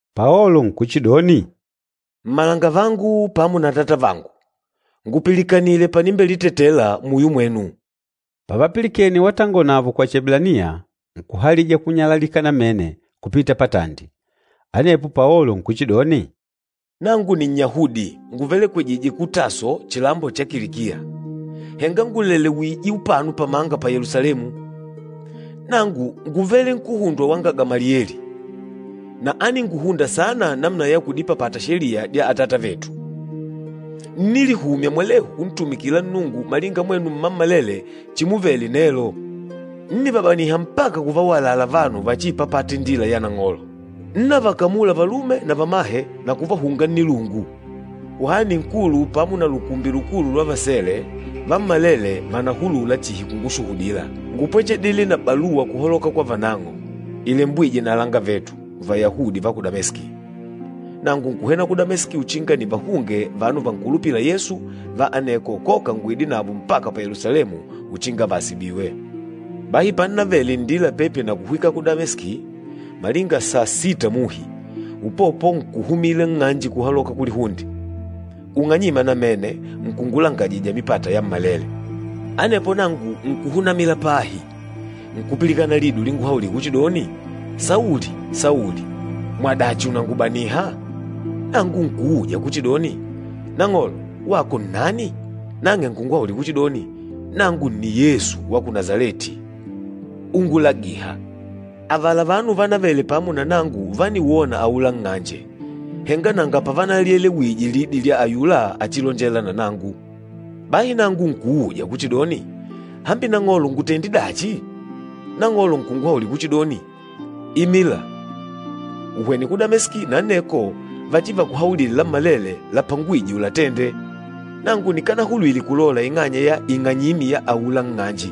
Paolo nkuchidoni, “Mmalangavangu pamo na atatavangu, ngupilikanile panilitetela muyo mwenu!” Pavapilikene watangola navo kwa Chieblaniya, nkuhalija kunyalalika namene kupita patandi. Anepo Paolo nkuchidoni, “Nangu Ninnyahudi, nguvelekwejîje ku Taso chilambo cha Kilikiya, henga ngùlelewije upano pamanga pa Yelusalemu. Nangu ngúvele nkuhundwa wanga Gamalieli, na áninguhunda saana namuna ya kudipapata Sheliya dya atatavetu. Ńnilihumya mwalehu kuntumikila Nnungu malinga mwenu mmammalele chimuvele nelo. Ńnivabaniha mpaka kuvawalala vanu vachiipapâta Indila ya Nang'olo. Ńnavakamula valume na vamahe na kuvahunga nnilungu. Kuhani Nkulu pamo na lukumbi lukulu lwa vasele, vammalele vànahulula chihi kungushuhudila. Ngúpwechedile na baluwa kuhaloka kwa vananng'o, ilembwîje na alangavetu Vayahudi va ku Dameski. Nangu nkuhwena ku Dameski uchinga nivahunge vanu vankulupîla Yesu va aneko koka nguide navo mpaka pa Yelusalemu uchinga vaasibiwe. Bahi pannavele nndila pepi na kuhwika ku Dameski, malinga saa sita muhi, upopo nkuhumila nng'anje kuhaloka kulihunde, ung'anyîma namene nkungulangajija mipata yammalele. Anepo nangu nkuhunamila pahi, nkupilikana lidi ulinguhaulila kuchidoni, ‘Sauli, Sauli! Mwadachi ùnangubaniha?’ Nangu nkuuja kuchidoni, ‘Nang'olo, wako nnani?’ Nang'e nkunguhaulila kuchidoni, ‘Nangu nni Yesu wa ku Nasaleti úngulagìhà.’ Avala vanu vanavele pamo na nangu vániwona aula nng'anje, henga nanga pavanalielewije lidi lya ayula achilonjêla na nangu. Bahi nangu nkuuja kuchidoni, ‘Hambi Nang'olo ngutende dachi?’ Nang'olo nkunguhaulila kuchidoni, ‘Imila, uhwene ku Dameski na aneko vachivakuhaulile lammalele lapangwîje ulatende.’ Nangu nikanahulwile kulola ing'anya ya ing'anyimi ya aula nng'anje,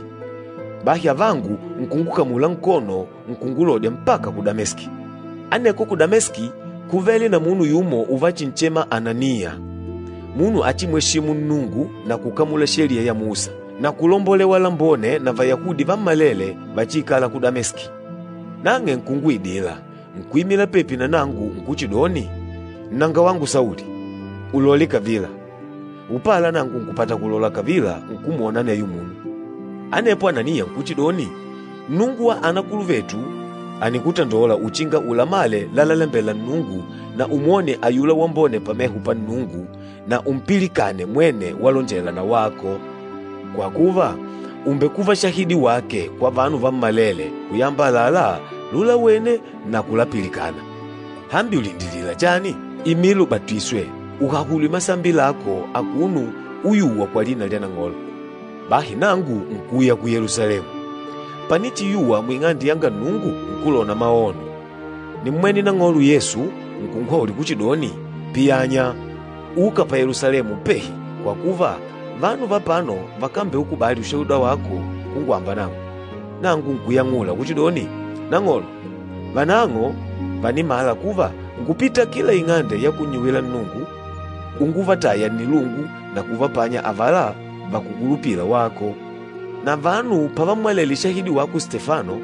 bahi avangu nkungukamula nkono nkungulodya mpaka ku Dameski. Aneko ku Dameski kúvele na munu yumo uvachinchema Ananiya, munu achimweshîmu Nnungu na kukamula Sheliya ya Musa, na kulombolewa lambone na Vayahudi vammalele vachiikâla ku Dameski. Nang'e nkunguidila, nkuimila pepi nanangu nkuchidoni, ‘Nnangawangu Sauli, ulole kavila!’ Upala nangu nkupata kulola kavila, nkumwona aneyo munu. Anepo Ananiya nkuchidoni, ‘Nnungu wa anakuluvetu ànikutandola uchinga ulamale lalalembela Nnungu na umwone ayula Wambone pameho pa Nnungu na umpilikane mwene walonjela na wako. Kwa kuva, ùmbekuva shahidi wake kwa vanu vammalele kuyamba àlalá lulawene na kulapilikana. Hambi ùlindilila chani? Imila ubatiswe, uhahulwe masambi lako akuno uyùwà kwa lina lya Nang'olo.’ Bahi nangu nkuuya ku Yelusalemu, panichiyuwa mu Ing'ande yanga Nnungu, nkulona maono. Nímmwene Nang'olo Yesu, nkunguhaulila kuchidoni, ‘Piyanya! Uka pa Yelusalemu upehi, kwa kuva vanu va apano vakambeukubali ushuhuda wako kungwamba nangu.’ Nangu nkuyang'ula kuchidoni, ‘Nang'olo, vanang'o vànimala kuva ngúpita kila ing'ande ya kunnyuwila Nnungu unguvataya nnilungu na kuvapanya avala vakukulupila wako. Na vanu pavammwalele shahidi wako Stefano,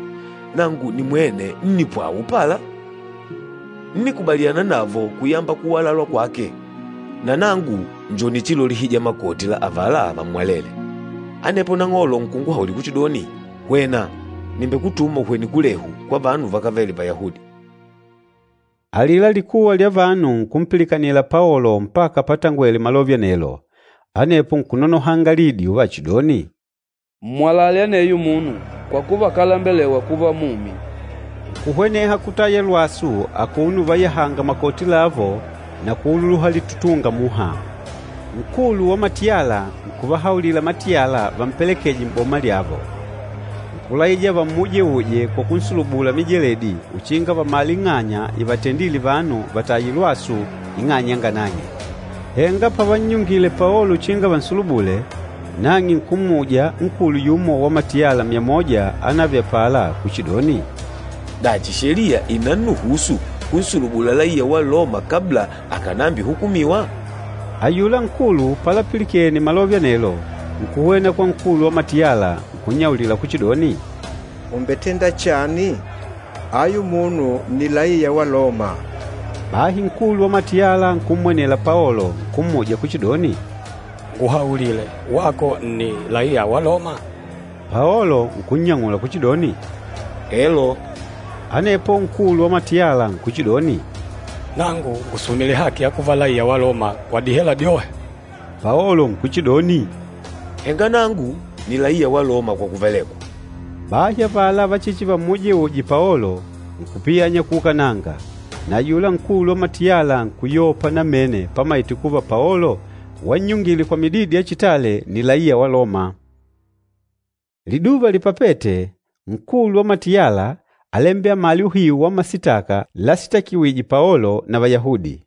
nangu nimwene ńnipwawa upala, ńnikubaliana navo kuyamba kuwalalwa kwake. Na nangu njo nichilolihija makoti la avala vammwalele.’ Anepo Nang'olo nkunguhaulila kuchidoni, ‘Hwena, nìmbekutuma uhwene kulehu, kwa vanu vakávele Vayahudi.’” Alila likuwa lya vanu nkumpilikanila Paolo mpaka patangwele malove anelo. Anepo nkunonohanga lidi uvachidoni, “Mmwalale aneyo munu, kwa kuva akálembelewa kuva mumi!” Nkuhweneha kutaya lwasu akuno uvayahanga makoti lavo na kuululuha litutunga muha. Nkulu wa matiyala nkuvahaulila matiyala vampelekeje m'boma lyavo. Nkulaija vammujeuje kwa kunsulubula mijeledi uchinga vamale ing'anya ivatendîle vanu vataye lwasu ing'anya yanga nang'e. Henga pavannyungile Paolo uchinga vansulubule, nang'e nkummuja nkulu yumo wa matiyala myamoja anavele apala kuchidoni, “Dachi, sheliya ìnannuhusu kunsulubula laiya wa Loma kabla akànambihukumiwa?” Ayula nkulu palapilikene malove anelo, nkuhwena kwa nkulu wa matiyala, nkunnyaulila kuchidoni, “Ùmbetenda chani? Ayu munu nni laiya wa Loma!” Bahi nkulu wa matiyala nkummwenela Paolo, nkummuja kuchidoni, “Nguhaulile, wako nni laiya wa Loma?” Paolo nkunnyang'ula kuchidoni, “Elo.” Anepo nkulu wa matiyala nkuchidoni, “Nangu ngùsumile haki ya kuva laiya wa Loma kwa dihela dyohe.” Paolo nkuchidoni, “Henga nangu ni laiya wa Loma kwa kuvelekwa.” Bahi avala vachichivamujeuje Paolo, nkupiyanya kuukananga. Na ayula nkulu wa matiyala nkuyopa namene pamaite kuva Paolo wannyungile kwa mididi ya chitale ni laiya wa Loma. Liduva lipapête, nkulu wa matiyala álambela amale uhiu wa masitaka lasitakiwîje Paolo na Vayahudi.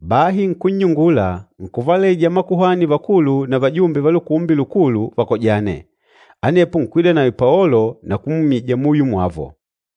Bahi nkunnyungula, nkuvalaija makuhani vakulu na vajumbe va Lukumbi Lukulu vakojane. Anepo nkwida nawe Paolo na kumwimija muyo mwavo.